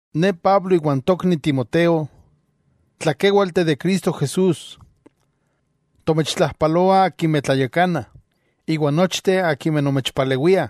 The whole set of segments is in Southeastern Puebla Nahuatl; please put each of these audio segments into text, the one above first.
Ne Pablo iwan tokni Timoteo, tlakéwalteh de Cristo Jesús, tomechtlajpaloah akimeh tlayakanah, iwa nochteh akimeh nomechpalewiah,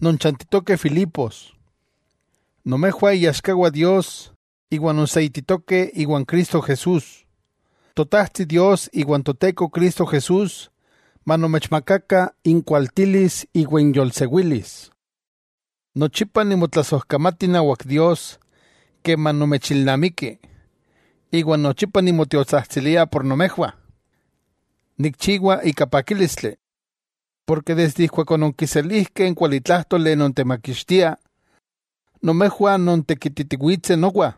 non chantitokeh Filipos. Nomejwah iaxkawah Dios iwa nonseititokeh iwan Cristo Jesús. Totajtsi Dios iwa n Toteko Cristo Jesús manomechmakakah inkualtilis iwa inyolsewilis. Nochipa nimotlasojkamati inawak Dios keman nomechilnamiki, iwa nochipa keman nimotiotsajtsilia por nomejwah, nikchiwa ika pakílistli. Porke desde ijkuak ononkiselijkeh n kualitlájtoli non temakixtia, nomejwah nontekititiwitseh nowa,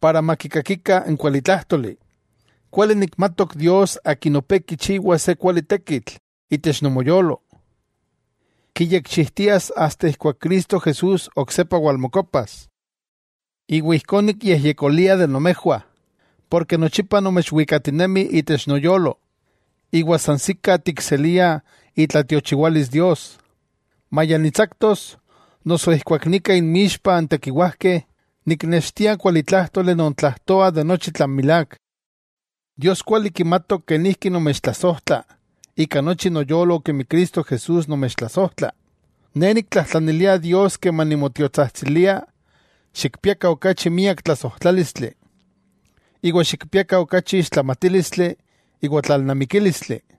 para makikakikah n kualitlájtoli. Kuali nikmatok Dios Akin opé kichiwa se kuali tekitl itech nomoyolo, kiyekchijtias asta ijkuak Cristo Jesús oksepa walmokopas. Ijkó nikyejyekolia de nomejwah, porke nochipa nomechwikatinemi itech noyolo, iwa sansikah tikseliah itlatiochiwalis Dios, maya nitsaktos, noso ijkuak nika inmixpah n tekiwajkeh niknextia n kualitlájtoli non tlajtoa de nochi tlan milák. Dios kuali kimatok kenijki nomechtlasojtla ika nochi noyolo kemi Cristo Jesús nomechtlasojtla. Ne niktlajtlanilia Dios keman nimotiotsajtsilia xikpiakah okachi miak tlasojtlálistli, iwa xikpiakah okachi ixtlamatílistli iwa tlalnamikílistli.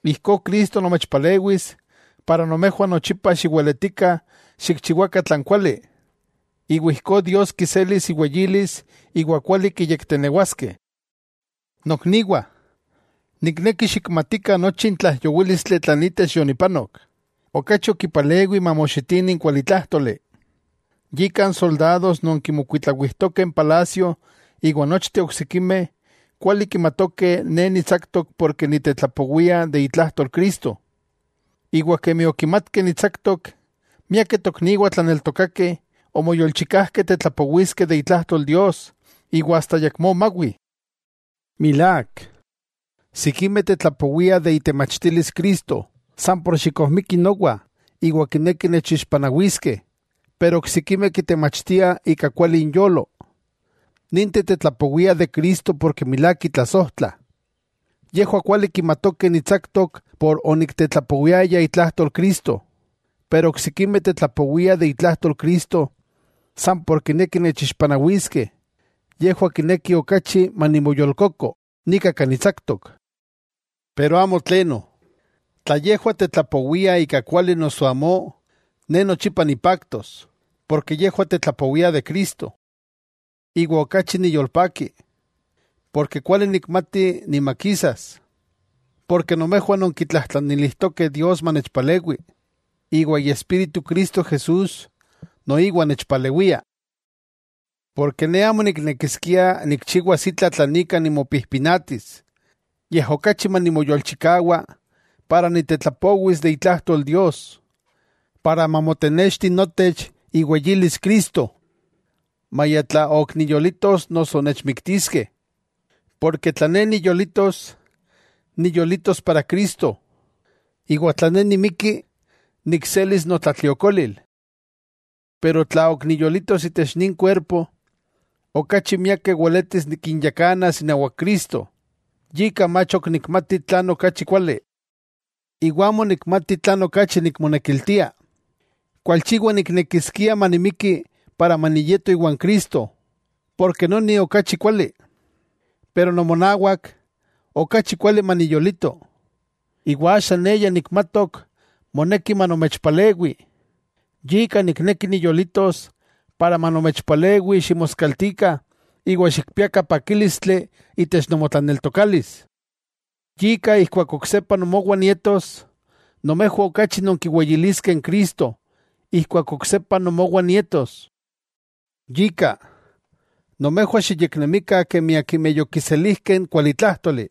Ijkó Cristo nomechpalewis. Nochipa xiweletikah xikchiwakah tlan kuali, iwa ijkó Dios kiselis iweyilis iwa kuali kiyektenewaskeh. Nokniwah, nikneki xikmatikah, nochi n tlaijyowílistli tlan itech yonipanok, okachi okipalewi mamoxitini n kualitlájtoli. Yika, n soldados non kimokuitlawijtokeh n palasio iwa nochteh oksikimeh kuali kimatokeh ne nitsaktok porke nitetlapowia de itlajtol Cristo. Iwa kemi okimatkeh nitsaktok, miakeh tokniwah tlaneltokakeh, omoyolchikajkeh tetlapowiskeh de itlajtol Dios, iwa asta ayakmó mawi. Milák, sikimeh kitetlapowiah itemachtilis Cristo san por xikojmikih nowa iwa kinekih nechixpanawiskeh, pero oksikimeh kitemachtiah ika kuali inyolo. Ninteh tetlapowiah de Cristo ken milák kitlasojtlah. Yejwah kuali kimatokeh nitsaktok por oniktetlapowiaya itlajtol Cristo. Pero oksikimeh tetlapowiah de itlajtol Cristo san por kinekih nechixpanawiskeh. Yejwah kinekih okachi manimoyolkoko nika kan nitsaktok. Amo tleno, tla yejwah tetlapowiah ika kuali noso amó, ne nochipa nipaktos, porke yejwah tetlapowiah de Cristo. Iwa okachi niyolpaki, ken kuali nikmati nimakisas, ken nomejwah nonkitlajtlanilijtokeh Dios manechpalewi, iwa Iespíritu Cristo Jesús noiwa nechpalewia. Ne amo niknekiskia nikchiwas itla tlan ika nimopijpinatis, yej okachi manimoyolchikawa para niktetlapowis itlajtol Dios, para mamotenexti notech iweyilis Cristo, maya tla ok niyolitos noso nechmiktiskeh. Tla ne niyolitos, niyolitos para Cristo. Iwa tla ne nimiki nikselis notlatliokolil. Pero tla ok niyolitos itech nin kuerpo, okachi miakeh weletis nikinyakanas inawak Cristo, yika mach ok nikmati tlan okachi kuali. Iwa amo nikmati tlan okachi nikmonekiltia: kualchiwa niknekiskia manimiki para maniyeto iwan Cristo, noni okachi kuali. Pero nomonawak, okachi kuali maniyolito. Iwa axa ne ya nikmatok moneki manomechpalewi, yika nikneki niyolitos para manomechpalewi ximoskaltikah iwa xikpiakah pakílistli itech nomotlaneltokalis. Yika ijkuak oksepa nomowah nietos, nomejwah okachi nonkiweyiliskeh n Cristo ijkuak oksepa nomowah nietos. Yika, nomejwah xiyeknemikah kemi akimeh yokiselijkeh n kualitlájtoli.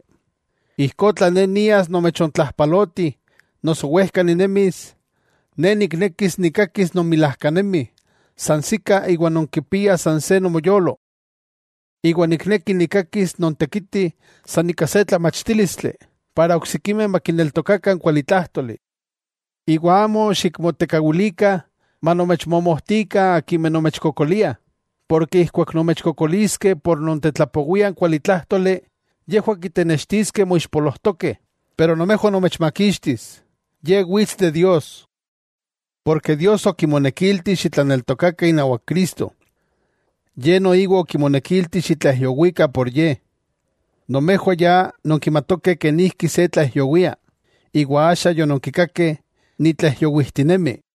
Ijkó tla ne nias nomechontlajpaloti noso wejka ninemis, ne niknekis nikkakis nonmilajkanemih sansikah iwa nonkipiah san se nomoyolo. Iwa nikneki nikkakis nontekitih san ika se tlamachtílistli para oksikimeh makineltokakah n kualitlájtoli. Iwa amo xikmotekawilikah manomechmomojtikah akimeh nomechkokoliah, porke ijkuak nomechkokoliskeh por nontetlapowiah n kualitlájtoli, yejwah kitenextiskeh moixpolojtokeh, pero nomejwah nomechmakixtis. Ye wits de Dios. Ken Dios okimonekilti xitlaneltokakah inawak Cristo, yej noiwa okimonekilti xitlaijyowikah por Ye. Nomejwah ya nonkimatokeh kenijki se tlaijyowia, iwa axa yononkikakeh nitlaijyowijtinemi.